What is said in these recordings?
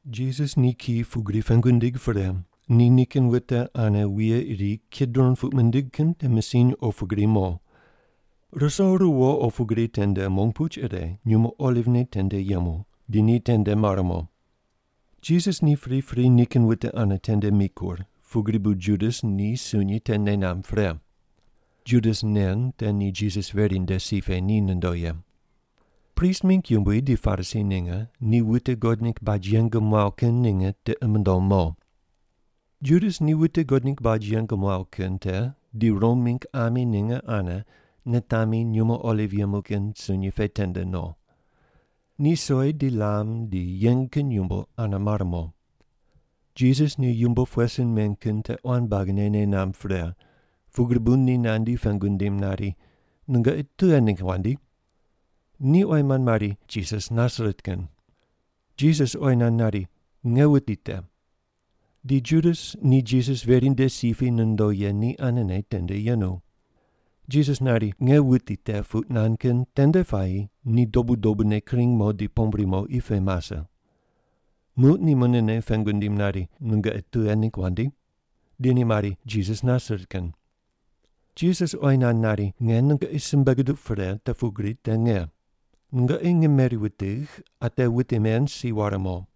Jisas ni kiyi pugri pengu nindig pre, ni nikin wute ane wuye iri Kidron puq mindig kin te misiny opu gri mo. Ruso ruwo opu gri tende mong puch ire nyumo olivne tende yemu, di ni tende mar mo. Jisas ni pripri nikin wute ane tende mikur, pugri bu Judas ni sunyi te nei namb pre. (Judas nen te ni Jisas veri nde si pe ni nondo ye.) Prist mingg yumbui di Parisi ninge ni wute God ningg baj yeng muaw kin ninge tiqi mundom mo. Judas ni wute God ningg baj yeng muaw kin te di Rom mingg ami ninge ane nitami nyumo oliv yemu kin sunyi pe tende no. Ni soi di lam di yeng kin yumbo ane mare mo. Jisas ni yumbo pughe sin meng kin te quan buagine nei namb pre, pugri bu ni nandi pengu nindim nari, “Nungoqi tughe ningg wandi?” Ni oyi mand mari, “Jisas Nasaret kin.” Jisas oyi nand nari, “Nge wuti te.” (Di Judas ni Jisas veri nde si pe ni nondo ye ni anene tende yenu.) Jisas nari, “Nge wuti te” puq nand kin tende puayi ni dobu dobune kring mo di pombri mo qi pe mase. Muq ni munene pengu nindim nari, “Nungoqi tughe ningg wandi?” Di ni mari, “Jisas Nasaret kin.” Jisas oyi nand nari, “Nge nungoqi simbe guduq pre te pugri te nge. Nungoqi nge meri wutigh, ate wute men si ware mo.”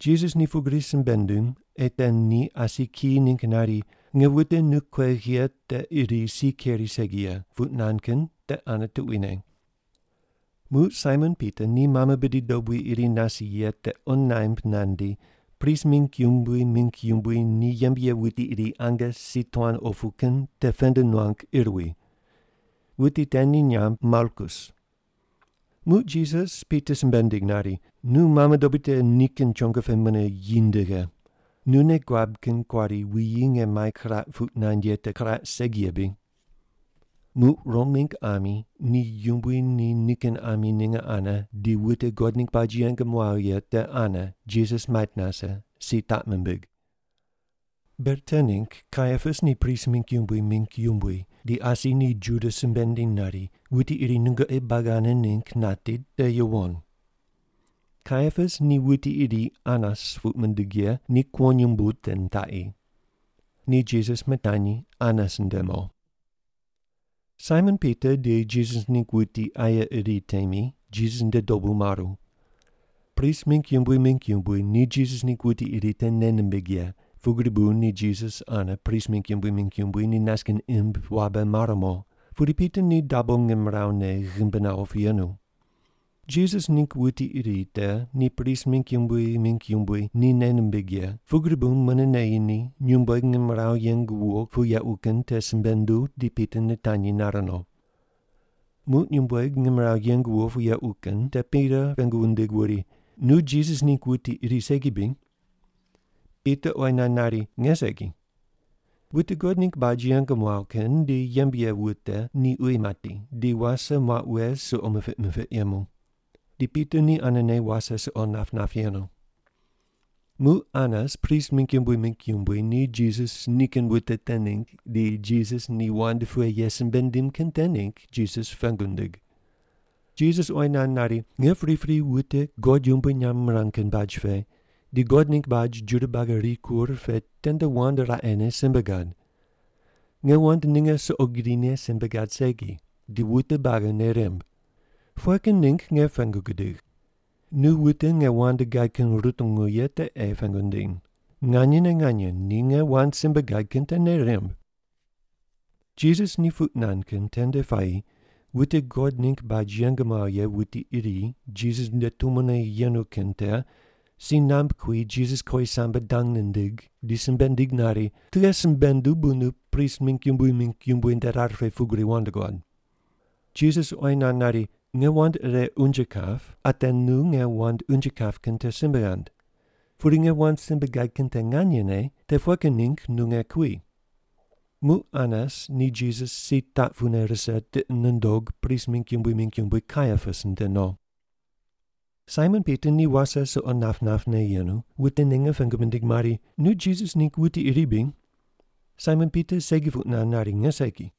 Jisas ni pugri simbe nindim ei te ni asi kiyi ningg nari, “Nge wute nu kuegh ye te iri si keri segi ye” puq nand kin te ane tuquine. Muq Saimon Pita ni mame bidi dobui iri nase ye te qo naimb nandi, prist mingg yumbui mingg yumbui ni yembe ye wuti iri ange si tuan opu kin te pend nuang ir wi. (Wuti te ni nyamb Malkus.) Muq Jisas Pita simbe nindig nari, “Nu mame dobui te nikin chongo pe mune yi ndighe. Nu nei guab kin kuari wuyi nge mai kiraq puq nand ye te kiraq segi ye bri?” Muq Rom mingg ami ni yumbui ni nikin ami ninge ane di wute God ningg baj yeng muaw ye te ane Jisas mait nase, si taq mimbig. Ber te ningg Kaiapas ni prist mingg yumbui mingg yumbui di asi ni Juda simbe nindiny nari, “Wuti iri nungoqi buagi ane ningg nati te yuwon.” Kaiapas ni wuti iri Anas puq mindig ye ni kuwonyumbu te nitaqi. Ni Jisas mitanyi Anas nde mo. Saimon Pita di Jisas ningg wuti aye iri temi Jisas nde dobu maru. Prist mingg yumbui mingg yumbui ni Jisas ningg wuti iri te nei nimbig ye, pugri bu ni Jisas ane prist mingg yumbui mingg yumbui ni nas kin imb wabe mar mo, pudi Pita ni dabo ngimrawu ne ghimbi nawo pu yenu. Jisas ningg wuti iri te ni prist mingg yumbui mingg yumbui ni nei nimbig ye, pugri bu mune neyi ni, nyumbueg ngimrawu yeng wuwo pu yequ kin te simbe nunduw di Pita nitanyi nar no. Muq nyumbueg ngimrawu yeng wuwo pu yequ kin te Pita pengu wundig wuri, “Nu Jisas ningg wuti iri segi bri?” Pita oyi nand nari, “Nge segi.” Wute God ningg baj yeng muaw kin di yembe ye wute ni uyi mati, di wase muaq wughe suqo mipiq mipiq yemu. Di Pita ni anene wase suqo nap nap yenu. Muq Anas, prist mingg yumbui mingg yumbui, ni Jisas nikin wute te ningg di Jisas ni wand pughe ye simbe nindim kin te ningg Jisas pengu nindig. Jisas oyi nand nari, “Nge pripri wute God yumbui nyamb mirang kin baj pe di God ningg baj Juda buagi rikur pe tende wand raqene simbe gad. Nge wand ninge suqo grine simbe gad segi. Di wute buagi nei rimb. Pughe kin ningg nge pengu gudigh? Nu wute nge wand gad kin rutungu ye te ei pengu ndiny. Nganyene nganye, ni nge wand simbe gad kin te nei rimb.” Jisas ni puq nand kin tende puayi wute God ningg baj yeng muaw ye wuti iri Jisas nde tumone yenu kin te si namb kui Jisas kowisambe dang nindig, di simbe nindig nari, “Tughe simbe nunduw bu nu prist mingg yumbui mingg yumbui nde rar pe pugri wand guad?” Jisas oyi nand nari, “Nge wand ire unje kap, ate nu nge wand unje kap kin te simbe ghand. Pudi nge wand simbe gad kin te nganyene, te pughe kin ningg nu nge kui?” Muq Anas ni Jisas si taq pune rise tiqi nundog prist mingg yumbui mingg yumbui, Kaiapas, nde no. Saimon Pita ni wase suqo nap napne yenu, wute ninge pengu mindig mari, “Nu Jisas ningg wuti iri bri?” Saimon Pita segi puq nand nari, “Nge segi.”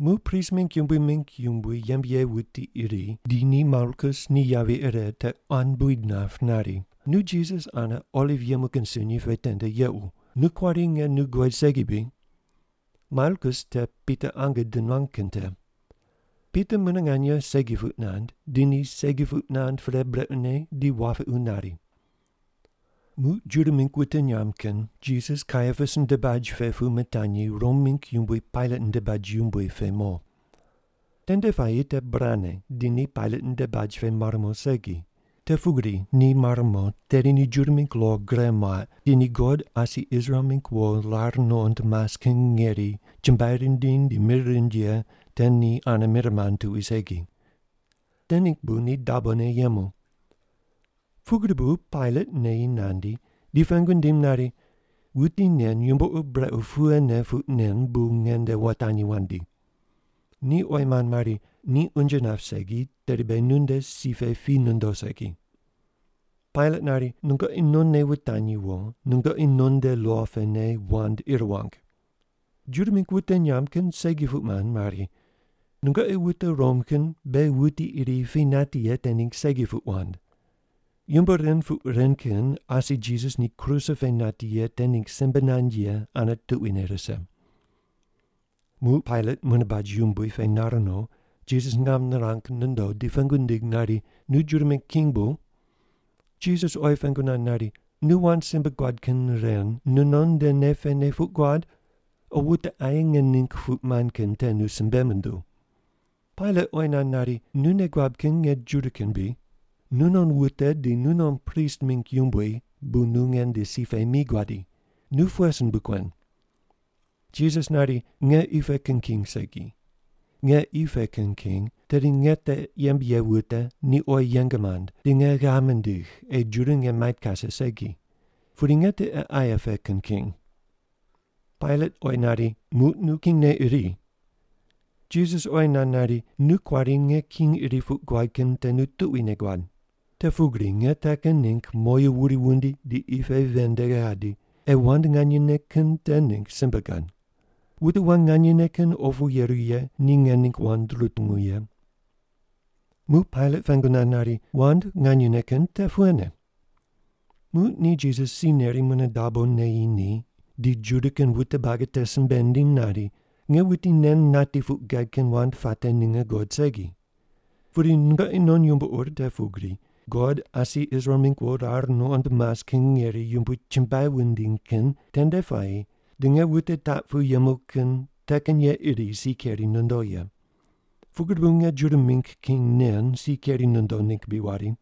Muq prist mingg yumbui mingg yumbui ni yembe ye wuti iri di ni Malkus ni yavi ire te quan buid nap nari, “Nu Jisas ane oliv yemu kin sunyi pe tende yequ. Nu kuari nge nu guqoid segi bri?” Malkus te Pita ange di nuang kin te. Pita mune nganye segi puq nand, di ni segi puq nand pre brequne di wapiqu nari. Muq Juda mingg wute nyamb kin Jisas Kaiapas nde baj pe pu mitanyi Rom mingg yumbui Pailat nde baj yumbui pe mo. Tende puayi te burane di ni Pailat nde baj pe mar mo segi. Te pugri ni mar mo tedi ni Juda mingg lo gure muaq di ni God asi Israel mingg wo rar nuqond mas kin ngeri chumbuai rindiny di mir rind ye te ni ane mir mand tuqui segi. Te ningg bu ni dabone yemu. Pugri bu Pailat neyi nandi di pengu nindim nari, “Wuti nen yumbo ur brequ pughene puq nen bu nge nde wutanyi wandi?” Ni oyi mand mari, “Ni unje nap segi, tedi beghi nunde si pe pi nondo segi.” Pailat nari, “Nungoqi nonne wutanyi wo, nungoqi non nde lo pene wand ir wang.” Juda mingg wute nyamb kin segi puq mand mari, “Nungoqi wute Rom kin beghi wuti iri pi nati ye te ningg segi puq wand.” Yumbo ren puq ren kin asi Jisas ni kruse pe nati ye te ningg simbe nand ye ane tuquine rise. Muq Pailat mune baj yumbui pe nar no, Jisas ngam nirang nondo, di pengu nindig nari, “Nu Juda mingg king bu?” Jisas oyi pengu nand nari, “Nu wand simbe guad kin ren nunon nde nei pene puq guad, o wute aye nge ningg puq mand kin te nu simbe munduw?” Pailat oyi nand nari, “Nu nei guab kin nge Juda kin bri? Nunon wute di nunon prist mingg yumbui bu nu nge nde si pe mi guadi. Nu pughe sin bu kuen?” Jisas nari, “Nge qi pe kin king segi. Nge qi pe kin king, tedi nge te yembe ye wute ni oyi yeng mand, di nge ghav mindigh ei Juda nge mait kase segi. Pudi nge tiqe aye pe kin king.” Pailat oyi nari, “Muq nu kingne iri.” Jisas oyi nand nari, “Nu kuari nge king iri puq guad kin te nu tuquine guad. Te pugri nge te kin ningg moyu wuri wundi di qi pe ven nde gadi, ei wand nganyene kin te ningg simbe gad. Wute wand nganyene kin opu yeru ye ni nge ningg wand rutungu ye.” Muq Pailat pengu nand nari, “Wand nganyene kin te pughene?” Muq ni Jisas si neri mune dabo neyi ni di Juda kin wute buagi te simbe nindiny nari, “Nge wuti nen nati puq gad kin wand puate ninge guqod segi. Pudi nungoqi non yumbo ur te pugri, God asi Israel mingg wo rar nuqond mas kin ngeri yumbui chumbuai wundiny kin tende puayi di nge wute taq pu yemu kin te kin ye iri si keri nondo ye. Pugri bu nge Juda mingg king nen si keri nondo ningg bri wari?”